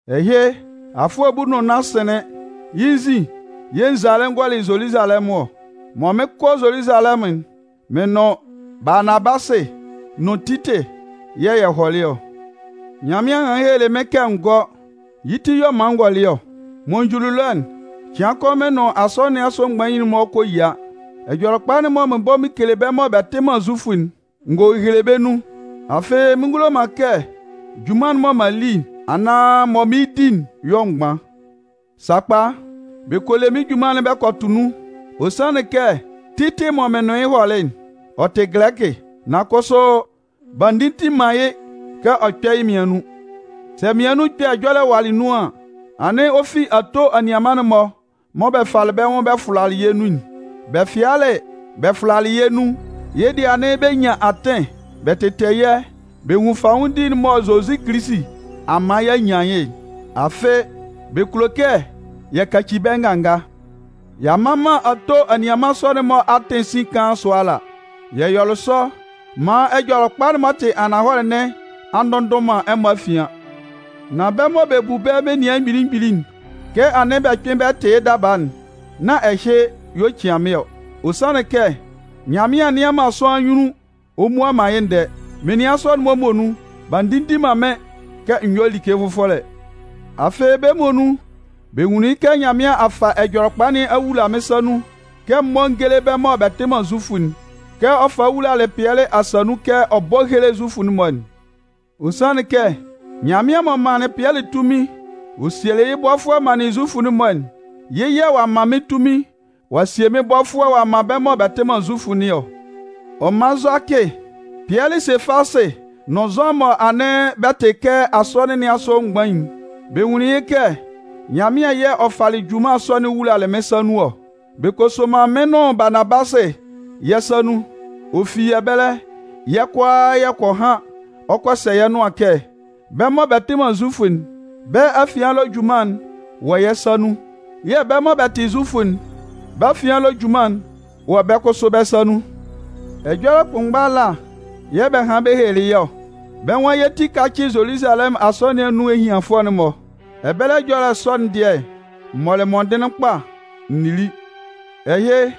Ɛhɩ, afʋɛ bulu nʋn nnan sɩnlɩn, yɩ́ nzin yɛ̂ n zalɩ n gɔlɩ Zoluzalɛmʋn ɔ. Mɔ mɩn 'kɔ Zoluzalɛmʋn'n, mɩn nʋn Baanabasɩ nʋn Titɩ yɛ̂ yɛ hɔlɩ ɔ. Nyanmɩan hanlɩn helelɩ mɩ́n kɛ n gɔ́. Yɩ́ ti y'ɔ man n gɔlɩ ɔ. Mɔ n juli ɛlɔ'n, cɩan kʋn mɩn nʋn Asɔnɩn nɩn asʋ mgbain'n-mɔ kɔ yia. Ɛjɔlɛkpa'n mɔ mɩn bɔ mɩn kele bɛ́ mɔ bɛ tɩ man Zufʋ'n, n gɔ hehele bɛ́ nun. Afɩ mɩn ngulo man kɛ junman'n mɔ m'an li, anaan mɔ mɩɩn di'n yɔ mgban. Sakpa, bɛ kɔ le mɩ́n junman'n bɛ kɔ tʋ nun. Ɔ sanlɩn kɛ Titɩ mɔ mɩn nʋn yɩ́ hɔlɩ'n, ɔ tɩ Gɛlɛkɩ. Nan kʋsʋ, b'a ndinndin man yɩ́ kɛ ɔ kpɛ́ yɩ́ mmian nun. Sɛ mmian nun ɛkpɛ ɛjɔlɛ walɩ nun an, anɩn ɔ fi ato anianman'n-mɔ mɔ bɛ falɩ bɛ́ nwʋn bɛ fʋlalɩ yɛ́ nun'n. Bɛ fɩalɩ bɛ fʋlalɩ yɛ́ nun, yɩ́ dɩɛ, anɩn bɛ nyan atɩn bɛ tɩtɛ yɛ́ bɛ nwun fanwʋndi'n mɔ Zozi Kilisi a man y'a nyan yɩ́'n. Afɩ, bɛ kulo kɛ yɛ kaci bɛ́ nganga. Y'a mman man ato anianman sɔ'n-mɔ atɩn sin kaan sʋa ala. Yɛ yɔlɩ sɔ maan Ɛjɔlɛkpa'n m'ɔ tɩ ananhɔlɛ nɩn a ndʋnndʋn man ɛmɔ afian. Nan bɛ́ mɔ bɛ bu bɛ́ menian mgbili mgbili'n, kɛ anɩn bɛ kpɩn bɛ tɩ yɩ́ daba'n, nán ɛhɩ y'ɔ cian mɩ́n ɔ. Ɔ sanlɩn kɛ, Nyanmɩan nnɩan man sʋanlan anyunnun ɔ mmua man yɩ́ ndɛɛ. Menian sɔ'n-mɔ muonun, b'a ndinndin man mɩ́n kɛ n yɔ́ like fʋfɔlɛ. Afɩ bɛ́ muonun bɛ nwunlɩn yɩ́ kɛ Nyanmɩan a fa Ɛjɔlɛkpa nɩn a wula mɩn sa nun kɛ m mɔ́ n géle bɛ́ mɔ bɛ tɩ man Zufʋ'n, kɛ ɔ falɩ wulalɩ Pɩɛlɩ asa nun kɛ ɔ bɔ́ héle Zufʋ'n-mɔ'n. Ɔ sanlɩn kɛ Nyanmɩan m'ɔ manlɩn Pɩɛlɩ tunmin ɔ sielɩ yɩ́ bɔfʋɛ manlɩn Zufʋ'n-mɔ'n, yɩ́ yɛ̂ ɔ'a man mɩ́n tunmin ɔ'a sie mɩ́n bɔfʋɛ ɔ'a man bɛ́ mɔ bɛ tɩ man Zufʋ nɩn ɔ. Ɔ man Zʋakɩ, Pɩɛlɩ (Sefasɩ) nʋn Zʋan mɔ anɩn bɛ tɩ kɛ asɔnɩn nɩn asʋ mgbain'n, bɛ nwunlɩn yɩ́ kɛ Nyanmɩan yɛ̂ ɔ falɩ junman sɔ'n wulalɩ mɩ́n sa nun ɔ. Bɛ kɔ soman mɩn nʋn Baanabasɩ yɛ́ sa nun. Ɔ fi ɛbɛlɛ, yɛ́ kʋalaa yɛ kɔ han, ɔ kɔ sɛ yɛ́ nʋan kɛ, bɛ́ mɔ bɛ tɩ man Zufʋ'n, bɛ́ afian ɛlɔ junman'n wɔ yɛ́ sa nun. Yɛ̂ bɛ mɔ bɛ tɩ Zufʋ'n, bɛ́ afian ɛlɔ junman'n wɔ bɛ́ kʋsʋ bɛ́ sa nun. Ɛjɔlɛ kʋnmgba ala yɛ̂ bɛ hanlɩn bɛ helelɩ yɛ́ ɔ. Bɛ́ nwan yɛ́ ti kácɩ Zoluzalɛmʋn Asɔnɩn nɩn anun ehianfʋɛ'n-mɔ. Ɛbɛlɛ ɛjɔlɛ sɔ'n dɩɛ, m mɔlɩ mɔndɩnlɩn kpa n nili. Ɛhɩ,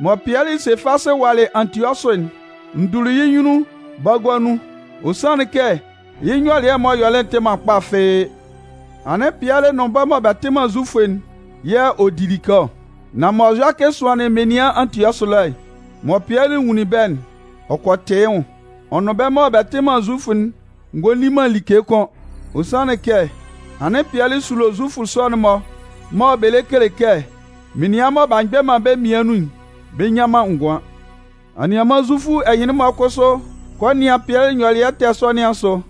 mɔ Pɩɛlɩ (Sefasɩ) walɩ Antiɔsʋ'n, n duli yɩ́ nyunnun bagua nun. Ɔ sanlɩn kɛ yɩ́ nyɔlɩɛ m'ɔ yɔlɩ'n tɩ man kpa fɩ́ɩ́. Anɩn Pɩɛlɩ nʋn bɛ́ mɔ bɛ tɩ man Zufʋ'n yɛ̂ ɔ di like ɔ. Nan mɔ Zʋakɩ sʋanlɩn menian Antiɔsʋ ɛlɔ, mɔ Pɩɛlɩ nwunlin bɛ́'n, ɔ kɔ tɩ yɩ́ nwʋn, ɔ nʋn bɛ́ mɔ bɛ tɩ man Zufʋ'n ngɔ li man like kʋ́n. Ɔ sanlɩn kɛ anɩn Pɩɛlɩ sulo Zufʋ sɔ'n-mɔ mɔ bɛ lɛ kele kɛ, menian mɔ b'a mgbɛ man bɛ́ mmian nun'n, bɛ nnyan man ngʋan. Anianman Zufʋ ɛhɩnlɩn-mɔ kʋsʋ kɔ nɩan Pɩɛlɩ nyɔlɩɛ ɛtɛ sɔ nɩn asʋ.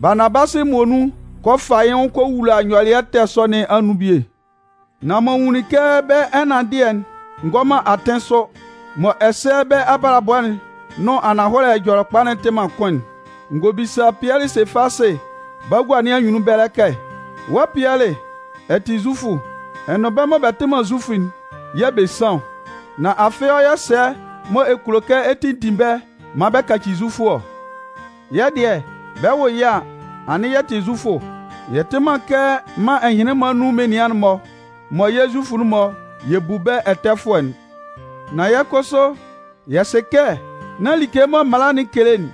Baanabasɩ muonun kɔ fa yɩ́ nwʋn kɔ wula nyɔlɩɛ ɛtɛ sɔ nɩn anun bie. Nan mɔ n nwunlin kɛ bɛ́ ɛnanndɩɛ'n ngɔ man atɩn sʋ, mɔ ɛsɛ bɛ́ abalabɔ'n nʋn ananhɔlɛ Ɛjɔlɛkpa'n tɩ man kʋn'n, n gɔ bisa Pɩɛlɩ (Sefasɩ) bagua nɩn anyunnun ɛbɛlɛ kɛ: “Wɔ́ Pɩɛlɩ, ɛ tɩ Zufʋ, ɛ nʋn bɛ́ mɔ bɛ tɩ man Zufʋ'n yɛ̂ bɛ san ɔ. Nan afɩ ɔ yɔ sɛ mɔ ɛ kulo kɛ ɛ tinndin bɛ́ maan bɛ kaci Zufʋ ɔ?” Yɛ́ dɩɛ, bɛ 'wʋ yɛ́ a, anɩn yɛ tɩ Zufʋ. Yɛ tɩ man kɛ mân ɛhɩnlɩn-mɔ anun menian'n-mɔ mɔ yɛ́ Zufʋ'n-mɔ yɛ bu bɛ́ ɛtɛfʋɛ'n. Nan kʋsʋ yɛ sɩ kɛ nán like mɔ mala'n kele'n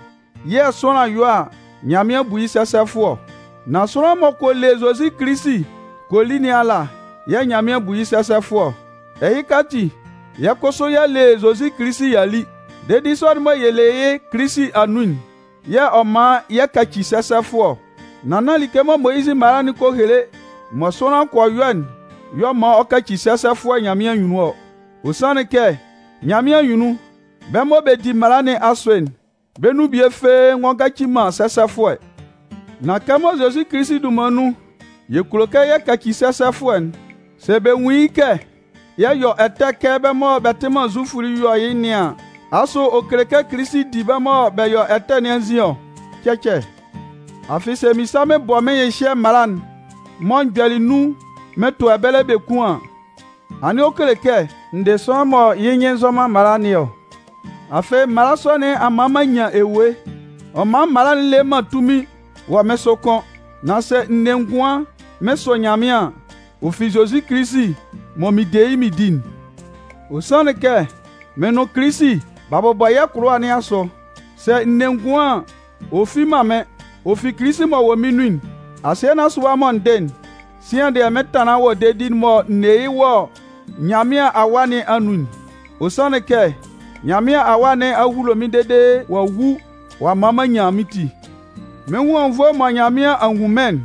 yɛ̂ sʋanlan yɔ a Nyanmɩan bu yɩ́ sɛsɛfʋɛ ɔ. Nan sʋanlan m'ɔ kɔ le Zozi Kilisi kɔ li nɩn ala yɛ̂ Nyanmɩan bu yɩ́ sɛsɛfʋɛ ɔ. Ɛhɩka ati, yɛ́ kʋsʋ y'a le Zozi Kilisi y'a li. Dedi sɔ'n mɔ yɛ le yɩ́ Kilisi anun'n yɛ̂ ɔ man yɛ kaci sɛsɛfʋɛ ɔ. Nan nán like mɔ Moyizɩ mala'n kɔ hele mɔ sʋanlan kɔ yɔ'n y'ɔ man ɔ kaci sɛsɛfʋɛ Nyanmɩan anyunnun ɔ. Ɔ sanlɩn kɛ Nyanmɩan anyunnun, bɛ́ mɔ bɛ di mala nɩn asʋ'n, bɛ́ nun bie fɩ́ɩ́ ngɔ ngaci man sɛsɛfʋɛ. Nan kɛmɔ Zozi Kilisi dunman nun yɛ kulo kɛ yɛ kaci sɛsɛfʋɛ'n, sɛ bɛ nwun yɩ́ kɛ yɛ yɔ ɛtɛ kɛ bɛ́ mɔ bɛ tɩ man Zufʋ'n yɔ yɩ́ nɩn an, asʋ ɔ kele kɛ Kilisi di bɛ́ mɔ bɛ yɔ ɛtɛ nɩn anzin ɔ? Cɛcɛ! Afɩ sɛ mɩn sa mɩn bɔ mɩn hyɩhyɛ mala'n mɔ m gbɛlɩ nun'n mɩn tʋ ɛbɛlɛ biekun an, anɩn ɔ kele kɛ n dɩ sʋanlan mɔ yɩ́ nyɩn nzɔ man mala nɩn ɔ. Afɩ mala sɔ nɩn a man m'an nyan ewue, ɔ man mala'n le man tunmin wɔ mɩ́n sʋ kʋ́n. Nan sɛ n ne ngʋan mɩn sʋ Nyanmɩan an, ɔ fi Zozi Kilisi mɔ mɩn de yɩ́ mɩn di'n. Ɔ sanlɩn kɛ, mɩ́n nʋn Kilisi b'a bʋbɔ yɛ́ kʋlʋwa nɩn asʋ. Sɛ n ne ngʋan an, ɔ fi man mɩ́n. Ɔ fi Kilisi m'ɔ wɔ mɩ́n nun'n. Asɩɛ nɩn asʋ ɛwa mɔ n dɩ'n, sian dɩɛ mɩn tanlan wɔ dedi'n mɔ n ne yɩ́ wɔ Nyanmɩan Awa nɩn anun'n. Ɔ sanlɩn kɛ Nyanmɩan Awa nɩn a hulo mɩ́n dede ɔ'a wu ɔ'a man m'an nyan mɩ́n ti. Mɩ́n nwʋn anwunnvoe'n mɔ Nyanmɩan a nwun mɩ́n'n,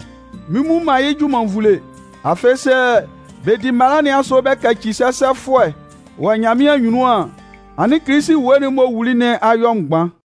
mɩn mmu man yɩ́ junman nvule. Afɩ, sɛ bɛ di mala nɩn asʋ bɛ kaci sɛsɛfʋɛ wɔ Nyanmɩan anyunnun an, anɩn Kilisi ewue'n m'ɔ wuli nɩn a yɔ mgban.